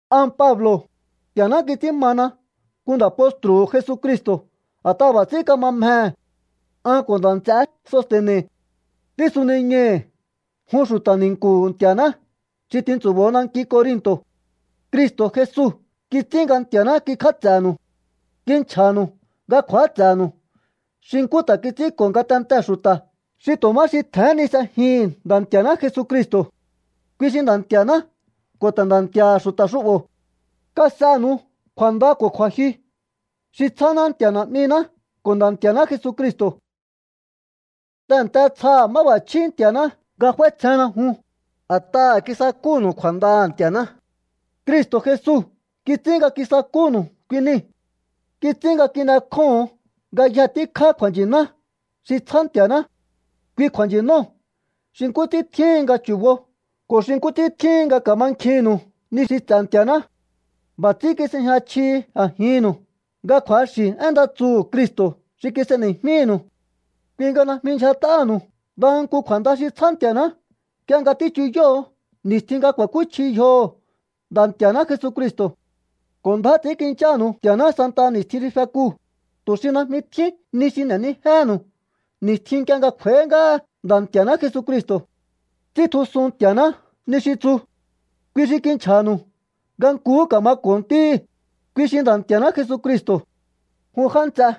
An Pablo̱, Nti̱a̱ná kits'ín mana nku nda̱ postru̱hu̱ Jesucristo̱ a̱t'aha̱ b'a̱ ts'ín kama mjehe̱. An ko̱ nda̱ nts'eé Soste̱ne̱ tísuniñai̱hi̱ jun xu̱ta̱ ni̱nku̱hu̱ Nti̱a̱ná xi tintsu̱bo̱o nanki Corinto̱. Cristo̱ Jesu kits'ín nga Nti̱a̱ná kikj'áts'e̱nu̱u. Kinchja̱nu̱u nga kju̱áts'e̱nu̱u xi nkú ta̱ kits'ínko̱ ngatentee̱ xu̱ta̱ xi tu̱ má xi tje̱hén ni s'ejihi̱n Nda̱ Nti̱a̱ná Jesucristo̱. Kui xi Nda̱ Nti̱a̱ná ko̱ ta̱ Nda̱ Nti̱a̱ha̱ xu̱ta̱ xu'bo̱. Kas'enu̱u kju̱a̱nda ko̱ kju̱a̱jyu xi tsjáná Nti̱a̱ Na̱'miná ko̱ Nda̱ Nti̱a̱ná Jesucristo̱. Tehe̱nte tsjaha̱ máb'a̱chjí Nti̱a̱ná nga f'áítsjenna jun, a̱t'aha̱ kisakúnu̱u kju̱a̱ndaha̱ Nti̱a̱ná. Cristo̱ Jesu kits'ín nga kisakúnu̱u kui niu̱. Kits'ín nga kin'ekjóho̱on ngayje tíkjá kju̱a̱nchi̱ná xi tsjá Nti̱a̱ná. Kui kju̱a̱nchi̱nóo̱ xi nkú ts'ín tjíhin nga chu̱bo ko̱ xi nkú ts'ín tjíhin nga ka̱mankjinnu̱u ni xi ts'e̱ Nti̱a̱ná. B'a̱ ts'ín kis'ejña chjihi a̱jinnu̱u nga kju̱axi̱ én nda tsuhu̱ Cristo̱ xi kis'eni̱jmínu̱u. Kui nga najmi ndyjat'aha̱nu̱u ndaha nku kju̱a̱nda xi tsjá Nti̱a̱ná nk'ie nga tíchuyóho̱o ni̱stjin nga ku̱a̱kúchji yjoho̱ Nda̱ Nti̱a̱ná Jesucristo̱. Ko̱ ndjá ts'i̱ínkinchánu̱u Nti̱a̱ná santaha ni̱stjin xi fekuu̱, tu̱ xi najmi tjín ni xi n'e̱nijéhe̱nu̱u ni̱stjin nk'ie nga kj'u̱a̱í ngáha Nda̱ Nti̱a̱ná Jesucristo̱. Ts'íntjusun Nti̱a̱ná ni xi tsu. Kui xi kinchja̱nu̱u nga nkuhú ka̱mako̱o Ntíhi̱, kui xi Nda̱ Nti̱a̱ná Jesucristo̱. Jun já nts'e,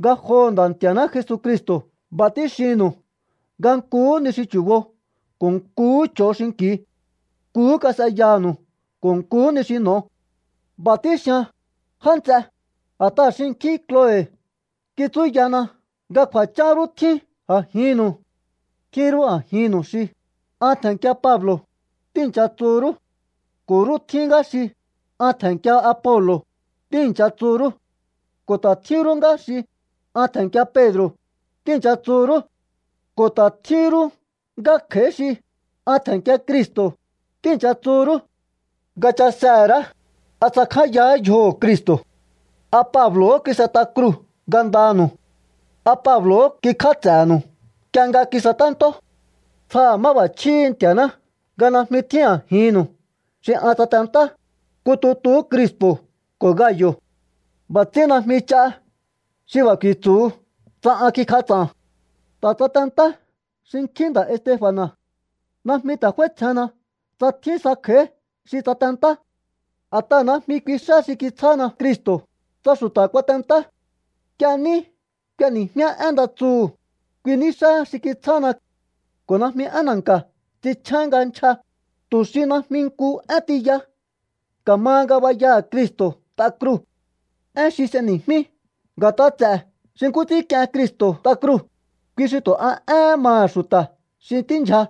ngajoho̱ Nda̱ Nti̱a̱ná Jesucristo̱ b'a̱ tíxinnu̱u nga nkuhú ni xi chu̱bo ko̱ nkuhú ch'o̱o xinki̱u. Nkuhú kas'eyanu̱u ko̱ nkuhú ni xi n'o̱o. B'a̱ tíxian, já nts'e, a̱t'aha̱ xinkjín Kloe kitsúyana nga kju̱a̱chán rú tjín a̱jinnu̱u. Tjín rú a̱jinnu̱u xi: “An tje̱nnkia Pablo̱”, tíi̱ncha tsu rú. Ko̱ rú tjín ngá xi: “An tje̱nnkia Apolo̱”, tíi̱ncha tsu rú. Ko̱ ta̱ tjín rú ngá xi: “An tje̱nnkia Pedro̱”, tíi̱ncha tsu rú. Ko̱ ta̱ tjín rú ngá kj'a̱í xi: “An tje̱nnkia Cristo̱”, tíi̱ncha tsu rú. Nga chasehe̱ ra̱á, ¿a tsakjányahá yjoho̱ Cristo̱? ¿A Pablo̱hó kis'et'a kruu̱ ngandanu̱u? ¿A Pablo̱hó kikj'áts'e̱nu̱u nk'ie nga kisaténtó? Tsjaha̱ máb'a̱chjíhi̱ Nti̱a̱ná nga najmi tjín a̱jinnu̱u xi an tsatentá, nku tutuhú Krispo̱ ko̱ Gayo̱. B'a̱ ts'ín najmi ch'a xi b'a̱ ku̱i̱tsu̱hu tsa an kikj'ats'a̱n. Ta̱ tsatentá xinkjín nda̱ Estefa̱na̱. Najmi ta̱ f'áítsjehenna tsa tjín sa kj'a̱í xi tsatentá. A̱t'aha̱ najmi kui xá xi kitsjána Cristo̱, tsa xu̱ta̱ kuatentá. Nk'ie ní k'ueni̱jmíá én nda tsuhu̱, kui ní xáha xi kitsjána. Ko̱ najmi én na̱nka̱ ts'inchjén nga nchja, tu̱ xi najmi nku én tiya ka̱maha ngabayaha̱ Cristo̱ t'a kruu̱. Én xi s'eni̱jmí nga̱t'a ts'e̱ xi nkú ts'ín k'ien Cristo̱ t'a kruu̱, kui xi tu̱ a éhén maha̱ xu̱ta̱ xi tíndyja.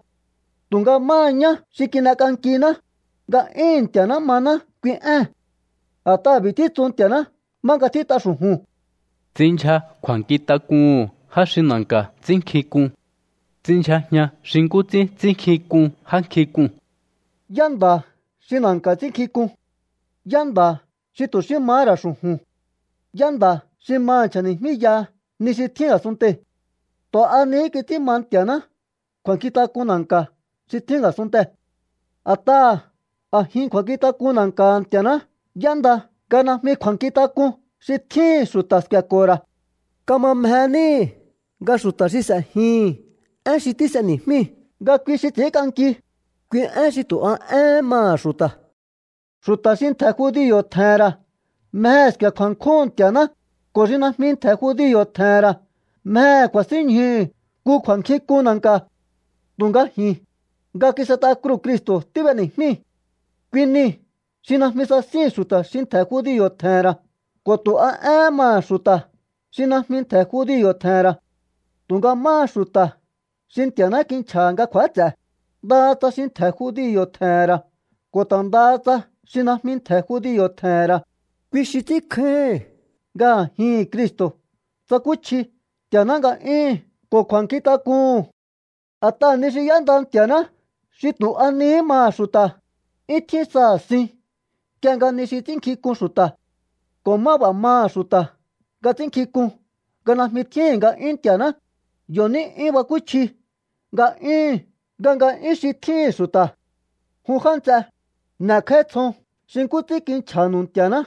Tu̱nga máha ñá xi kin'ek'ankiná, nga'yúhu̱n Nti̱a̱ná maná kui ée̱n. A̱t'aha̱ b'i̱ títsu Nti̱a̱ná má nga tjít'a xu̱ju̱n: Ts'inndyja kju̱a̱nkjintak'uhu̱n já xi na̱nka̱ ts'ínnkjink'un. Ts'inndyjajian xi nkú ts'ín ts'ínnkjink'un já nkjink'uu̱n. ¿Yá nda̱ xi na̱nka̱ ts'ínnkjink'un? ¿Yá nda̱ xi tu̱ xí mahá ra̱ xu̱ju̱n? ¿Yá nda̱ xi maha̱ nchja̱ni̱jmíyaha ni xi tjín a̱sunntei̱? Tu̱ a nihí kits'ín ma Nti̱a̱ná kju̱a̱nkjintak'un na̱nka̱ xi tjín a̱sunntee̱. A̱t'aha̱ a̱jin kju̱a̱nkjintak'un na̱nka̱ha̱ Nti̱a̱ná y'énda nga najmi kju̱a̱nkjintak'un xi tjíhi̱n xu̱ta̱ sku̱e̱ko̱ho̱ ra̱. Kama mje níhi̱ nga xu̱ta̱ xi s'e̱jihi̱n én xi tís'eni̱jmíu̱, nga kui xi ts'i̱ínk'anki, én xi tu̱ a éhén maha̱ xu̱ta̱. Xu̱ta̱ xi ntje̱ judio̱ tje̱he̱n ra̱ mjehe̱ sku̱e̱ kju̱a̱nkjúhu̱n Nti̱a̱ná, ko̱ xi najmi ntje̱ judio̱ tje̱he̱n ra̱ mjehe̱ ku̱a̱sínñjuhu̱ nku kju̱a̱nkjink'un na̱nka̱. Tu̱nga ji̱n, nga kis'et'a kruu̱ Cristo̱ tíb'eni̱jmíi̱. Kui nii̱ xi najmi sasíhi̱n xu̱ta̱ xi ntje̱ judio̱ tje̱he̱n ra̱ ko̱ tu̱ a éhén maha̱ xu̱ta̱ xi najmi ntje̱ judio̱ tje̱he̱n ra̱. Tu̱nga máha xu̱ta̱ xi Nti̱a̱ná kinchja̱ha̱ nga kju̱áts'e, ndaha tsa xi ntje̱ judio̱ tje̱he̱n ra̱ ko̱ ta̱ ndaha tsa xi najmi ntje̱ judio̱ tje̱he̱n ra̱, kui xi ts'ínkjáíhi̱n nga a̱jihi̱n Cristo̱ tsakúchji Nti̱a̱ná nga'yúhu̱n ko̱ kju̱a̱nkjintak'uhu̱n. A̱t'aha̱ ni xi y'énda Nti̱a̱ná xi tu̱ a nihí maha̱ xu̱ta̱, 'yún tjín saha̱ sin nk'ie nga ni xi ts'ínnkjink'un xu̱ta̱. Ko̱ má b'a̱ maha̱ xu̱ta̱ nga ts'ínnkjink'un nga najmi tjíhi̱n nga'yún Nti̱aṉá, yo̱ ní 'yún bakúchji nga'yúhu̱n nga nga'yún xi tjíhi̱n xu̱ta̱. Jun já nts'e, n'e̱kj'áítsjon xi nkú ts'ín kinchja̱nu̱u Nti̱a̱ná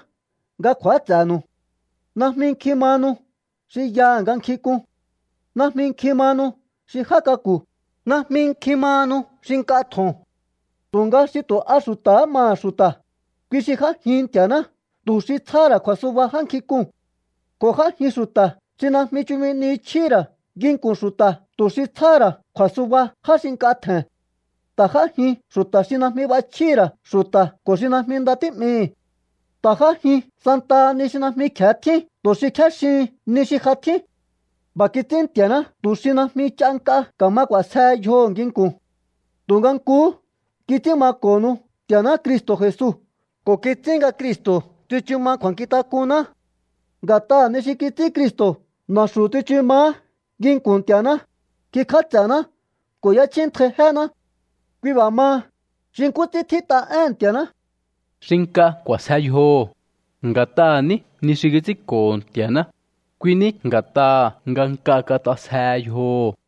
nga kju̱áts'e̱nu̱u. Najmi nkjin mahanu xi yaha̱ nga nkjink'un. Najmi nkjin mahanu xi já k'aku̱. Najmi nkjin mahanu xi nk'a tjo̱on. Tu̱nga xi tu̱ a xu̱ta̱há maha̱ xu̱ta̱, kui xi j'ájin Nti̱a̱ná tu̱ xi tsjáha̱ ra̱ kju̱a̱suba já nkjink'uu̱n. Ko̱ j'ájin xu̱ta̱ xi̱ najmi chumi ni chjíhi̱ ra̱ nginku̱n xu̱ta̱ tu̱ xi tsjáha̱ ra̱ kju̱a̱suba já xi nk'a tje̱n. Ta̱ j'ájin xu̱ta̱ xi najmi b'achjíhi̱ ra̱ xu̱ta̱ ko̱ xi najmi nda tí'mihi̱. Ta̱ j'ájin santaha ni xi najmi kje̱e tjín tu̱ xi kjéxihin ni xi ja tjín. B'a̱ kits'ín Nti̱a̱ná tu̱ xi najmi ch'a nk'a ka̱ma k'u̱a̱sjehe yjoho̱ nginku̱n. Tu̱nga nkuhú kits'ín mako̱nu̱u Nti̱a̱ná Cristo̱ Jesu ko̱ kits'ín nga Cristo̱ tsichu ma kju̱a̱nkjintak'unná. Nga̱t'aha̱ ni xi kits'ín Cristo̱ na̱xu̱ tsichu maá nginku̱n Nti̱a̱ná, kikj'áts'e̱ná ko̱ y'échjíntjai jéná. Kui b'a̱ maha, xi nkú ts'ín tjít'a éhe̱n Nti̱a̱ná: “Xi nk'a k'u̱a̱sje yjoho̱, nga̱t'aha̱ ní ni xi kits'ínko̱ho̱ Nti̱a̱ná, kui ní nga̱t'aha̱ nga nk'a kat'asjehe yjoho̱.”